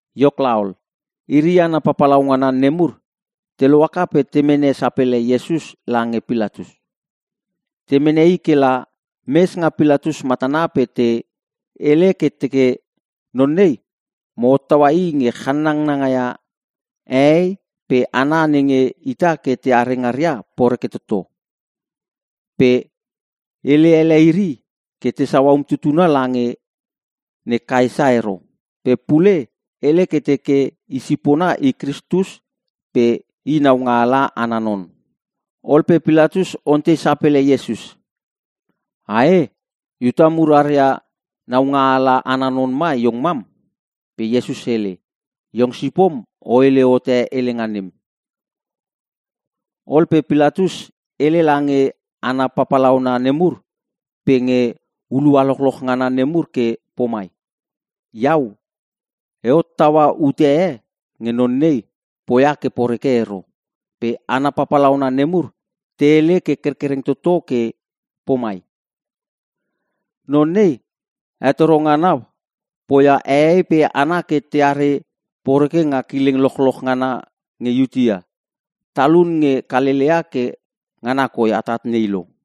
Iok laol, Iri hana papalaungana nemur te lohaka pe te mene sapele Iesus lange Pilatus. Te mene i ke la mes nga Pilatus matana pe te hele ke te teke, “Non nei, mo hottaua i nge chanangaia hehei pe hana nenge ita ke teare ngaria poreke toto. Pe hele ele iri ke tesau umtutuna lange ne Kaesa ero. Pe pule hele ke teke i sipona i Kristus pe i naungaala ana non.” Ol pe Pilatus ontei sapele Iesus. “Ae, Iuta mur aria naungaala ana non ma iong mam?” Pe Iesus hele, “Iong sipom o hele hote helenga nem.” Ol pe Pilatus hele lange hana papalauna nemur pe nge hulua lochloch ngana nemur ke pomai, “Iau e hottaua ute e nge non nei poia ke poreke ero.” Pe hana papalauna nemur te hele ke kerkereng toto ke pomai, “Non nei hetoro ngana poia hehei pe hana ke teare poreke nga kileng lochloch ngana nge Iutea! Talune nge Kalelea ke ngana koi atat nei lo!”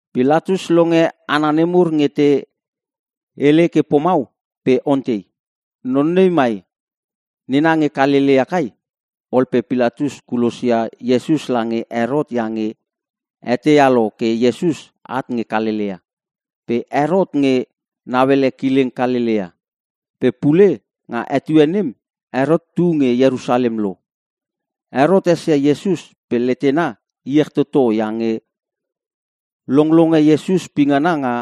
Pilatus longe hana nemur nge te hele ke pomau pe ontei, “Non nei mai nena nge Kalelea kai?” Ol pe Pilatus kulosia Iesus lange Herot iange eteia lo ke Iesus at nge Kalelea. Pe Herot nge nauele kileng Kalelea. Pe pule nga etue nem, Herot tu nge Ierusalem lo. Herot esia Iesus pe letena iech toto iange longlonge Iesus pingana nga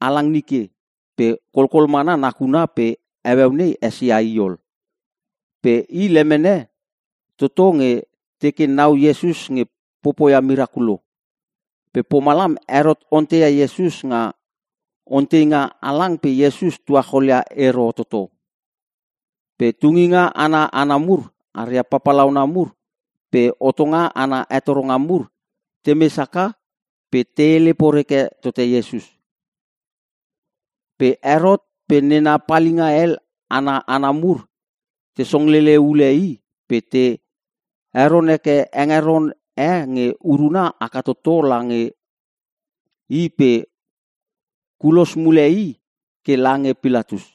halang nike pe kolkol mana nakuna pe heueu nei esia i ol. Pe i lemene toto nge teke nau Iesus nge popoi mirakulo. Ke pomalam Herot onteia Iesus nga onteinga halang pe Iesus tuacholia i ero toto. Pe tunginga ana hana mur aria papalauna mur pe hotonga ana hetoronga mur temes haka pe te hele poreke tote Iesus. Pe Herot pe nena palinga hel ana hana mur te songlele ule i pe te heron heke hengeron e nge uruna haka toto lange i pe kulos mule i ke lange Pilatus.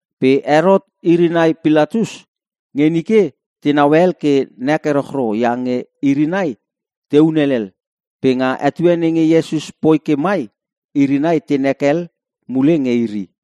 Pe Herot iri nai Pilatus, nge nike tenau hel ke nek erochro iange iri nai tehun helel. Pe nga etue nenge Iesus poi ke mai, iri nai tenek hel mule nge iri.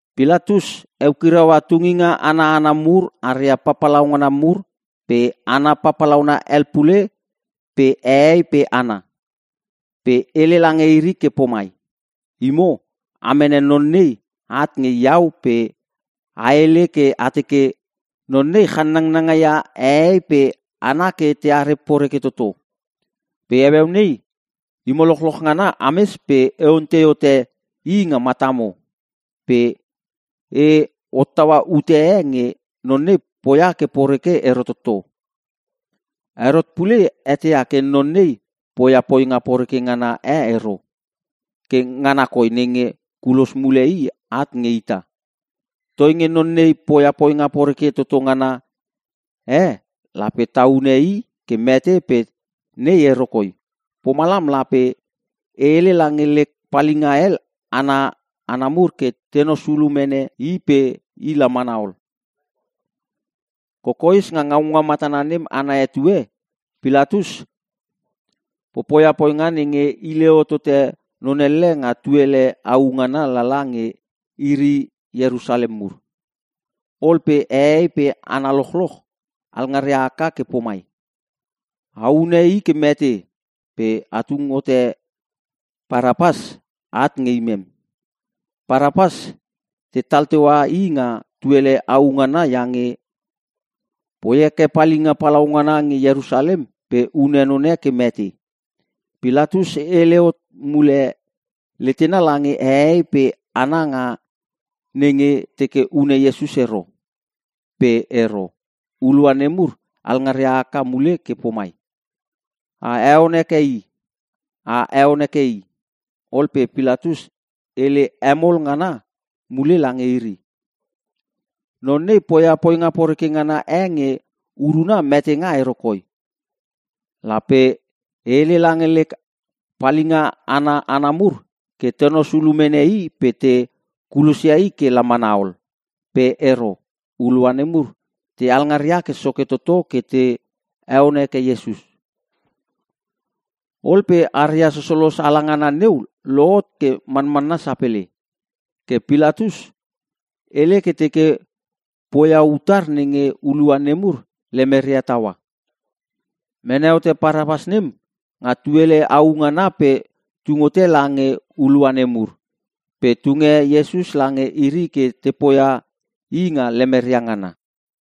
Pilatus eukiraua tunginga ana hana mur aria papalauna mur pe hana papalauna hel pule pe hehei pe hana. Pe hele lange iri ke pomai, “Imo, a mene non nei at nge iau pe a hele ke a teke, Non nei channangnanga ia hehei pe hana ke teare poreke toto. Pe heueu nei, imo lochloch ngana ames pe e ontei hote i nga matamo, pe e hottaua ute e nge non nei poia ke poreke ero toto. Herot pule eteia ke non nei poia poinga poreke ngana e ero, ke ngana koi nenge kulos mule i at nge ita. Toinge non nei poia poinga poreke toto ngana e lape ta hune i ke mete pe nei ero koi. Pomalam lape e hele lange lek palinga hel ana hana mur ke tenos ulu mene i pe i la mana ol.” Kokoes, nga ngaunga matana nem ana etue, Pilatus popoia poinga nenge hile hotote non elle nga tuele au ngana lala nge iri Ierusalem mur. Ol pe hehei pe hana lochloch alngaria haka ke pomai, “A hune i ke mete! Pe a tung hote Parapas at nge imem!” (Parapas tetal teua i nga tuele au ngana iange poi heke palinga palaungana nge Ierusalem pe hune none ke mete.) Pilatus hele hot mule letena lange hehei pe hana nga nenge teke hune Iesus ero. Pe ero. Hulua nemur alngaria haka mule ke pomai, “A heon heke i! A heon heke i!” Ol pe Pilatus hele hemol ngana mule lange iri, “Non nei poia poinga poreke ngana e nge uruna metenga ero koi! Lape e hele lange lek palinga ana hana mur ke te nos ulu mene i pe te kulosia i ke la mana ol.” Pe ero. Hulua nemur te alngaria ke soke toto ke te heon heke Iesus. Ol pe aria sosolos ala ngana neu, lohot ke manmanna sapele. Ke Pilatus hele ke teke poia utar nenge hulua nemur lemeria taua. Mene hote Parapas nem nga tuele au, pe tung hote lange hulua nemur. Pe tunge Iesus lange iri ke te poia i nga lemeria ngana.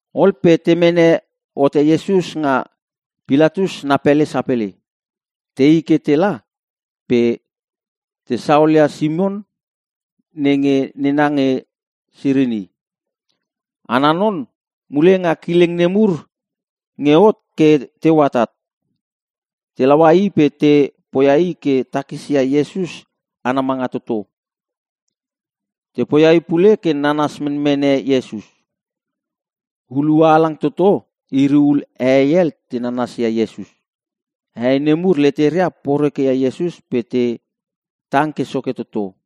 Ol pe te mene hote Iesus nga Pilatus na pele sapele. Tei ke tela pe te saolia Simon nenge nena nge Sirini. Ana non mule nga kileng nemur nge hot ke teu atat. Te laua i pe te poia i ke takisia Iesus ana manga toto. Te poia i pule ke nanas menmene Iesus. Hulua halang toto iri hul hehei hel te nanasia Iesus. Hehei nemur leteria porekeia Iesus pe te tang ke soke toto.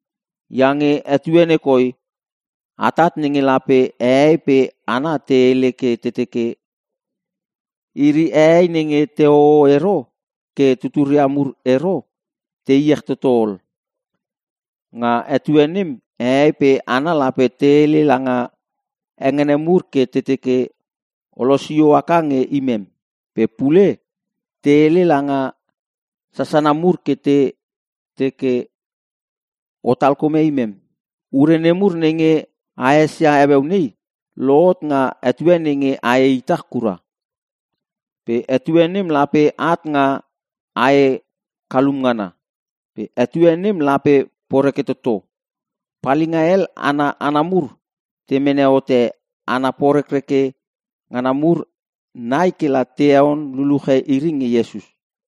Iange etue nei koi atat nenge lape hehei pe hana te hele ke teke, ‘Iri hehei nenge tehoho ero ke tuturia mur ero, te iech toto ol!’ Nga etue nem, hehei pe hana lape te hele langa hengene mur ke teke, ‘O losio aka nge imem.’ Pe pule, te hele langa sasana mur ke te teke, ‘Otal kome imem.’ Ure nemur nenge a esia heueu nei, lohot nga etue nenge ae itach kura. Pe etue nem lape at nga ae kalum ngana. Pe etue nem lape poreke toto.” Palinga hel ana hana mur te mene hote hana porekreke ngana mur nai kela te heon luluche iri nge Iesus.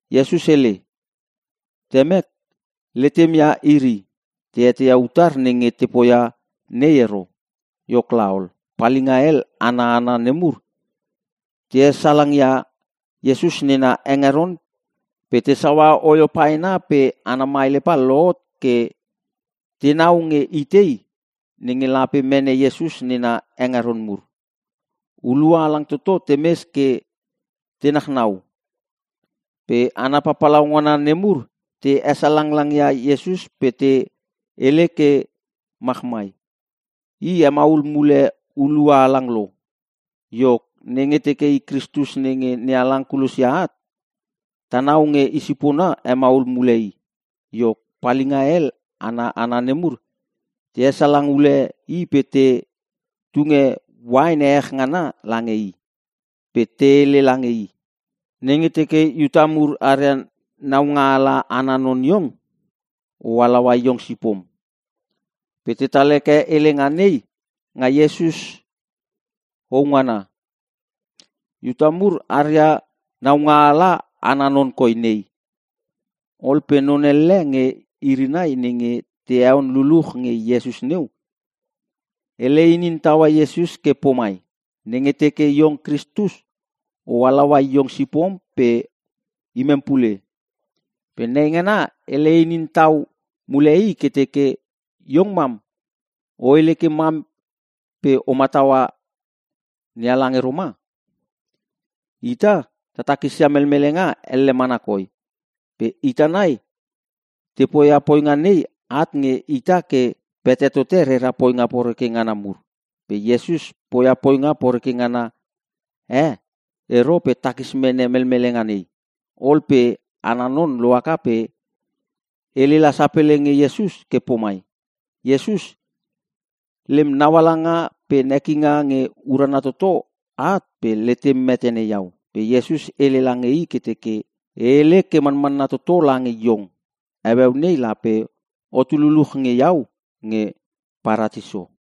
Iesus hele, “Temek, letem ia iri, te eteia utar nenge te poia nei ero.” Iok laol, palinga hel ana hana nemur te hesalangia Iesus nena hengeron pe te saua oio paena pe ana maelepa lohot ke tenau nge itei nenge lape mene Iesus nena hengeron mur. Hulua halang toto temes ke te nachnau pe hana papalauna nemur te hesalang langia Iesus pe te hele ke machmai, “I, hemaul mule hulua halang lo. Iok, nenge teke i Kristus nenge NeHalang kulosia at, tanau nge i sipona hemaul mule i!” Iok, palinga hel ana hana nemur te hesalang ule i pe te tunge uain ehech ngana lange i. Pe te hele lange i, “Nenge teke Iuta mur aria naungaala ana non iong, o halaua iong sipom!” Pe tetal heke helenga nei nga Iesus hou ngana, “IUTA MUR ARIA NAUNGAALA ANA NON KOI NEI.” Ol pe non elle nge iri nai nenge te heon luluch nge Iesus neu, hele inin taua Iesus ke pomai, “Nenge teke iong Kristus, o halaua iong sipom pe imem pule!” Pe neingana hele inin tau mule i ke teke, “Iong mam, o hele ke mam pe o mataua NeHalang ero ma? Ita ta takisia melmelenga elle mana koi. Pe ita nai, te poia poinga nei at nge ita ke pete tote rera poinga poreke ngana mur. Pe Iesus poia poinga poreke ngana e ero pe takis mene melmelenga nei.” Ol pe ana non loaka pe hele la sapele nge Iesus ke pomai, “Iesus, lem naualanga pe nekinga nge urana toto at pe letem metene iau.” Pe Iesus hele lange i ke teke, “E hele ke manmanna toto lange iong, heueu nei lape otu luluch nge iau nge Paratiso.”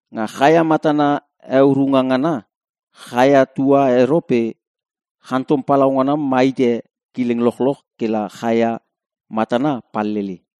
Nga chaia matana heurunga ngana, chaia tua ero pe chantom palaungana ma hite kileng lochloch kela chaia matana palele.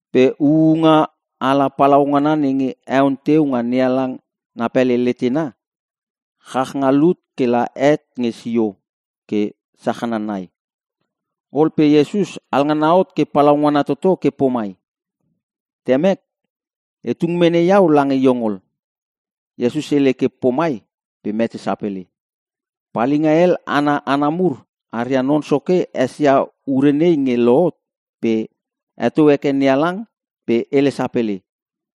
Pe huunga ala palaungana nenge heon teu nga NeHalang na pele letena, chach nga lut kela het nge sio ke sachana nai. Ol pe Iesus alangana hot ke palaungana toto ke pomai, “Temek, e tung mene iau lange iong ol.” Iesus hele ke pomai pe mete sapele. Palinga hel ana hana mur aria non soke esia ure nei nge lohot pe heto heke NeHalang pe hele sapele,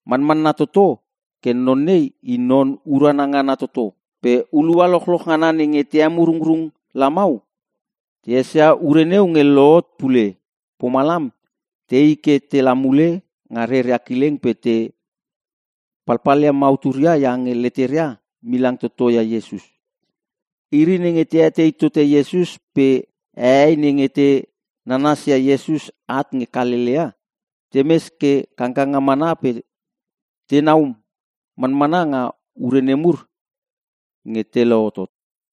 “Manmanna toto ke non nei i non urana ngana toto!” Pe hulua lochloch ngana nenge te emurungrung lamau te esia ure neu nge lohot pule. Pomalam tei ke tela mule nga reria kileng pe te palpalia mauturia iange leteria milang toto ia Iesus. Iri nenge te etei tote Iesus pe hehei nenge te nanasia Iesus at nge Kalelea, temes ke kangkanga mana pe tenau manmana nga ure nemur nge te lohotot.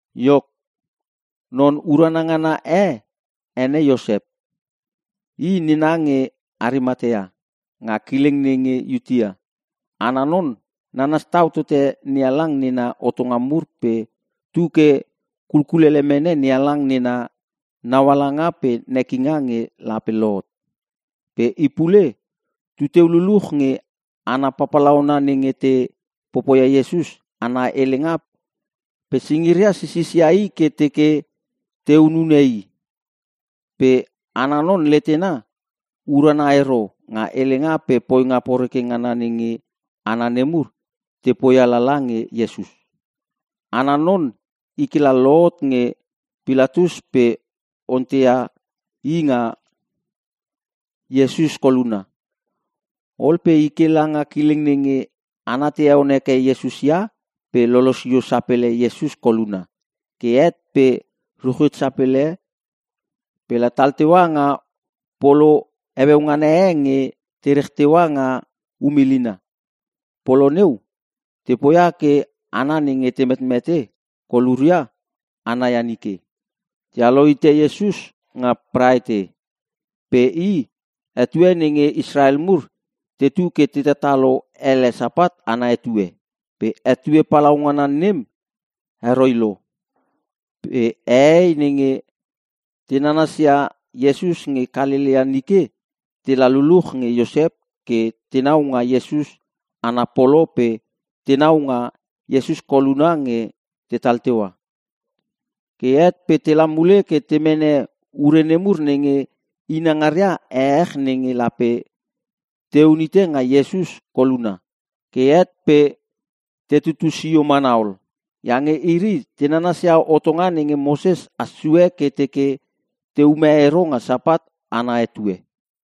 Iok, non urana ngana e ene Iosep. I, nena nge Arimatea, nga kileng nenge Iutea. Ana non, nanas tau tote NeHalang nena hotonga mur pe tu ke kulkulele mene NeHalang nena naualanga pe nekinga nge lape lohot. Pe i pule, tuteu luluch nge hana papalauna nenge te popoia Iesus ana helenga pe singiria sisisia i ke te teke te hunune i. Pe ana non letena urana ero nga helenga pe poinga poreke ngana nenge hana nemur te poia lala nge Iesus. Ana non i kela lohot nge Pilatus pe onteia i nga Iesus koluna. Ol pe i ke langa kileng nenge hana te heon heke Iesus ia pe lo losio sapele Iesus koluna. Ke het pe ruchit sapele, pela tal teua nga polo heueu ngana e nge te rech teua nga um ilina. (Polo neu, te poia ke hana nenge te metmete koluria ana ia nike.) Tealo hite Iesus nga Praete, pe i etue nenge Israel mur tetu ke te tatalo ele Sapat ana etue. Pe etue palaungana nem heroi lo. Pe hehei nenge te nanasia Iesus nge Kalelea nike tela luluch nge Iosep ke tenau nga Iesus ana polo pe tenau nga Iesus koluna nge tetal teua. Ke het pe tela mule ke te mene ure nemur nenge inangaria ehech nenge lape teun hite nga Iesus koluna. Ke het pe tetutu sio mana ol. Iange iri te nanasia hotonga nenge Moses has sue ke teke te ume ero nga Sapat ana etue.